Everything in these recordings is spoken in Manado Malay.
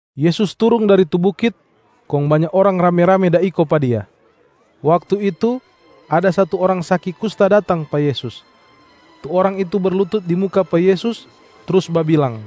Yesus turung dari tu bukit, kong banya orang rame-rame da iko pa Dia. Waktu itu, ada satu orang saki kusta datang pa Yesus. Tu orang itu berlutut di muka pa Yesus, trus babilang,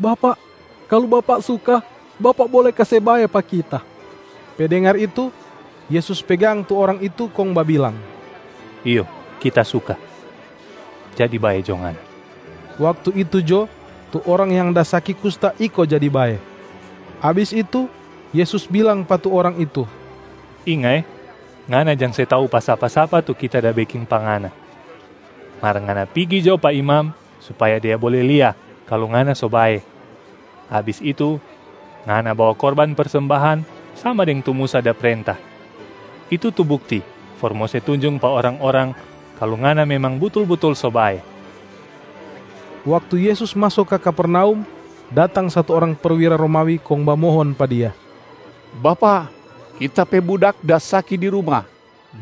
“Bapak, kalu Bapak suka, Bapak bole kase bae pa kita.” Pe dengar itu, Yesus pegang tu orang itu kong babilang, “Iyo Kita suka, jadi bae jo ngana!” Waktu itu jo, tu orang yang da saki kusta iko jadi bae. Abis itu, Yesus bilang pa tu orang itu, “Inga eh! Ngana jang se tau pa sapa-sapa tu Kita da beking pa ngana. Mar ngana pigi jo pa imam supaya dia bole lia kalu ngana so bae. Abis itu, ngana bawa korban persembahan sama deng tu Musa da prenta, itu tu bukti for mo se tunjung pa orang-orang kalu ngana memang butul-butul so bae.” Waktu Yesus maso ka Kapernaum, datang satu orang perwira Romawi kong bamohon pa Dia, “Bapak, kita pe budak da saki di ruma.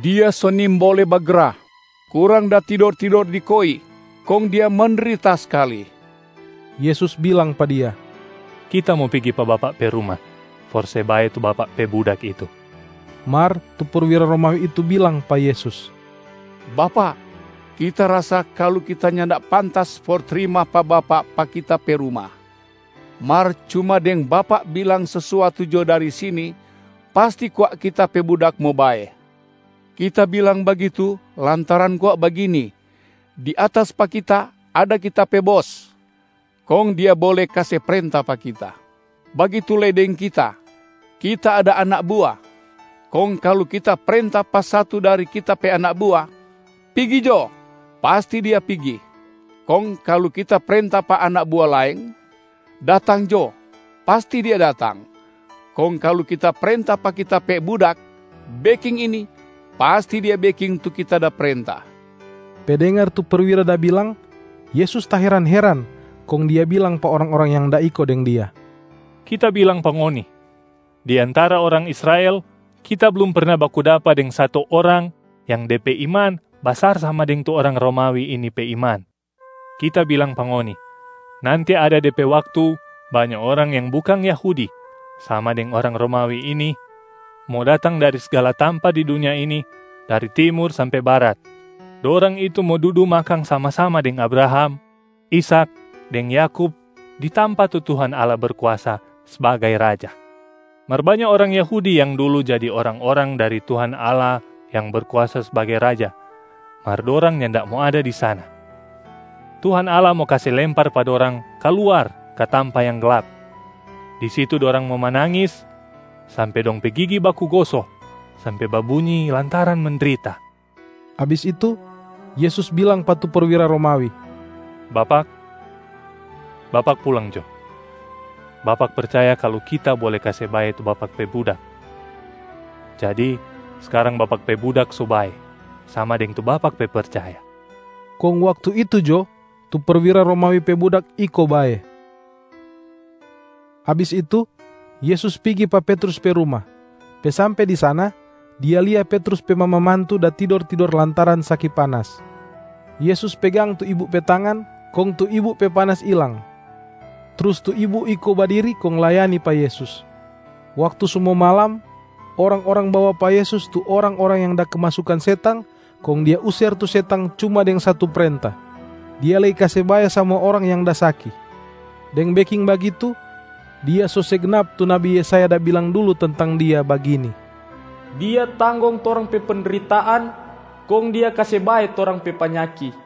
Dia so nimbole bagra, kurang da tidor-tidor di koi, kong dia mendrita skali.” Yesus bilang pa dia, “Kita mo pigi pa bapak pe ruma for se bae tu bapak pe budak itu.” Mar tu perwira Romawi itu bilang pa Yesus, “Bapak, kita rasa kalu kita nyanda pantas for trima pa Bapak pa kita pe ruma. Mar cuma deng Bapak bilang sesuatu jo dari sini, pasti kwa kita pe budak mo bae. Kita bilang bagitu, lantaran kwa bagini: di atas pa kita, ada kita pe bos, kong dia bole kase prenta pa kita. Bagitu lei deng kita, kita ada anak bua, kong kalu kita prenta pa satu dari kita pe anak bua, ‘Pigi jo!’ pasti dia pigi. Kong kalu kita prenta pa anak bua laeng, ‘Datang jo!’ pasti dia datang. Kong kalu kita prenta pa kita pe budak, ‘Beking ini!’ pasti dia beking tu kita da prenta.” Pe dengar tu perwira da bilang, Yesus taheran-heran, kong Dia bilang pa orang-orang yang da iko deng Dia, “Kita bilang pa ngoni, di antara orang Israel Kita blum perna baku dapa deng satu orang yang de pe iman basar sama deng tu orang Romawi ini pe iman. Kita bilang pa ngoni, nanti ada de pe waktu banya orang yang bukang Yahudi sama deng orang Romawi ini mo datang dari sgala tampa di dunia ini, dari Timur sampe Barat. Dorang itu mo dudu makang sama-sama deng Abraham, Ishak deng Yakub di tampa tu Tuhan Allah Berkuasa sbagai Raja. Mar banya orang Yahudi yang dulu jadi orang-orang dari Tuhan Allah yang Berkuasa sbagai Raja, mar dorang nyanda mo ada di sana. Tuhan Allah mo kase lempar pa dorang kaluar ka tampa yang glap.a Di situ dorang mo manangis sampe dong pe gigi baku goso sampe babunyi lantaran mendrita.” Abis itu, Yesus bilang pa tu perwira Romawi, “Bapak, bapak pulang jo. Bapak percaya kalu Kita bole kase bae tu bapak pe budak, jadi skarang bapak pe budak so bae sama deng tu bapak pe percaya.” Kong waktu itu jo, tu perwira Romawi pe budak iko bae. Abis itu, Yesus pigi pa Petrus pe ruma. Pe sampe di sana, Dia lia Petrus pe mama mantu da tidor-tidor lantaran saki panas. Yesus pegang tu ibu pe tangan kong tu ibu pe panas ilang. Trus tu ibu iko badiri kong layani pa Yesus. Waktu so mo malam, orang-orang bawa pa Yesus tu orang-orang yang da kemasukan setang kong Dia user tu setang cuma deng satu prenta.b Dia lei kase bae samua orang yang da saki. Deng beking bagitu, Dia so se gnap tu nabi Yesaya da bilang dulu tentang Dia bagini, “Dia tanggong torang pe pendritaan, kong Dia kase bae torang pe panyaki.”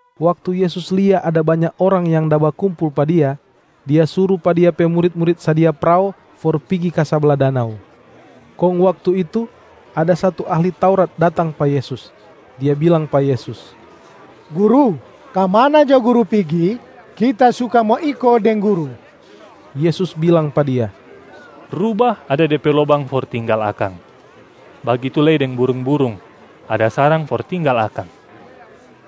Waktu Yesus lia ada banya orang yang da bakumpul pa Dia, Dia suru pa Dia pe murit-murit sadia prao for pigi ka sabla danau. Kong waktu itu, ada satu ahli Taurat datang pa Yesus. Dia bilang pa Yesus, “Guru, ka mana jo Guru pigi, kita suka mo iko deng Guru.” Yesus bilang pa dia, “Rubah ada de pe lobang for tinggal akang, bagitu lei deng burung-burung ada sarang for tinggal akang,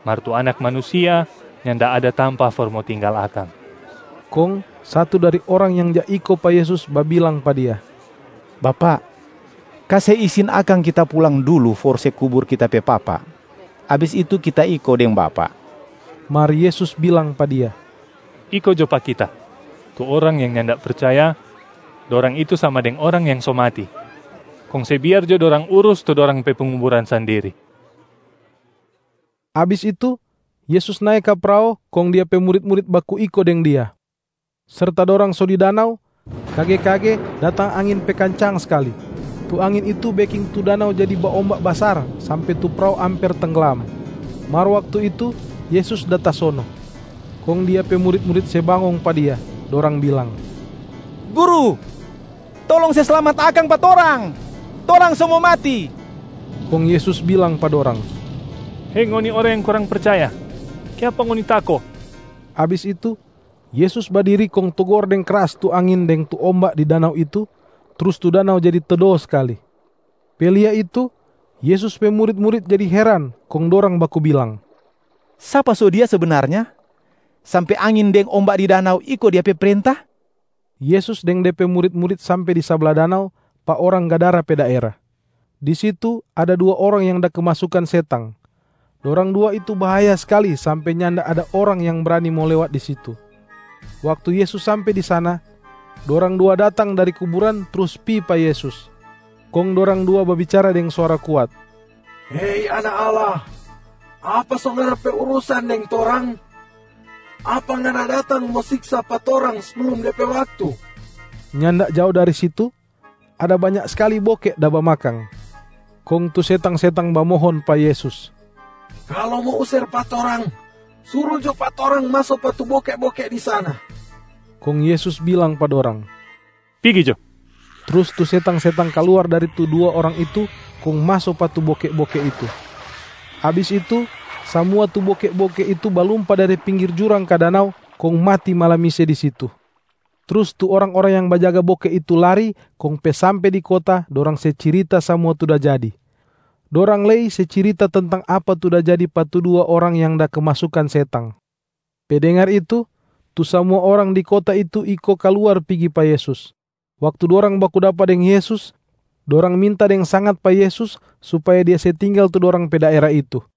mar tu Anak Manusia nyanda ada tampa for mo tinggal akang.” Kong satu dari orang yang ja iko pa Yesus babilang pa Dia, “Bapak, kase isin akang kita pulang dulu for se kubur kita pe papa, abis itu kita iko deng Bapak.” Mar Yesus bilang pa dia, “Iko jo pa Kita. Tu orang yang nyanda percaya, dorang itu sama deng orang yang so mati, kong se biar jo dorang urus tu dorang pe penguburan sandiri.”c Abis itu, Yesus nae ka prao kong Dia pe murit-murit baku iko deng Dia. Serta dorang so di danau, kage-kage datang angin pe kancang skali. Tu angin itu beking tu danau jadi baomba basar sampe tu prao amper tengglam. Mar waktu itu Yesus da tasono. Kong Dia pe murit-murit se bangong pa Dia, dorang bilang, “Guru, tolong se slamat akang pa torang, torang so mo mati.” Kong Yesus bilang pa dorang, “Hei ngoni orang yang kurang percaya, kiapa ngoni tako?” Abis itu, Yesus badiri kong togor deng kras tu angin deng tu omba di danau itu, trus tu danau jadi tedo skali. Pe lia itu, Yesus pe murit-murit jadi heran, kong dorang baku bilang, “Sapa so Dia sebenarnya sampe angin deng omba di danau iko Dia pe prenta?” Yesus deng De pe murit-murit sampe di sabla danau, pa orang Gadara pe daera. Di situ ada dua orang yang da kemasukan setang. Dorang dua itu bahaya skali sampe nyanda ada orang yang brani mo lewat di situ. Waktu Yesus sampe di sana, dorang dua datang dari kuburan trus pi pa Yesus. Kong dorang dua babicara deng suara kuat, “Hei Anak Allah! Apa so Ngana pe urusan deng torang? Apa Ngana datang mo siksa pa torang seblum de pe waktu?” Nyanda jao dari situ, ada banya skali boke da bamakang. Kong tu setang-setang bamohon pa Yesus, “Kalu mo user pa torang, suru jo pa torang maso pa tu boke-boke di sana.” Kong Yesus bilang pa dorang, “Pigi jo!” Trus tu setang-setang kaluar dari tu dua orang itu kong maso pa tu boke-boke itu. Abis itu, samua tu boke-boke itu balumpa dari pinggir jurang ka danau kong mati malamise di situ. Trus tu orang-orang yang bajaga boke itu lari kong pe sampe di kota dorang se cirita samua tu da jadi. Dorang lei se cirita tentang apa tu da jadi pa tu dua orang yang da kemasukan setang. Pe dengar itu, tu samua orang di kota itu iko kaluar pigi pa Yesus. Waktu dorang baku dapa deng Yesus, dorang minta deng sangat pa Yesus supaya Dia se tinggal tu dorang pe daera itu.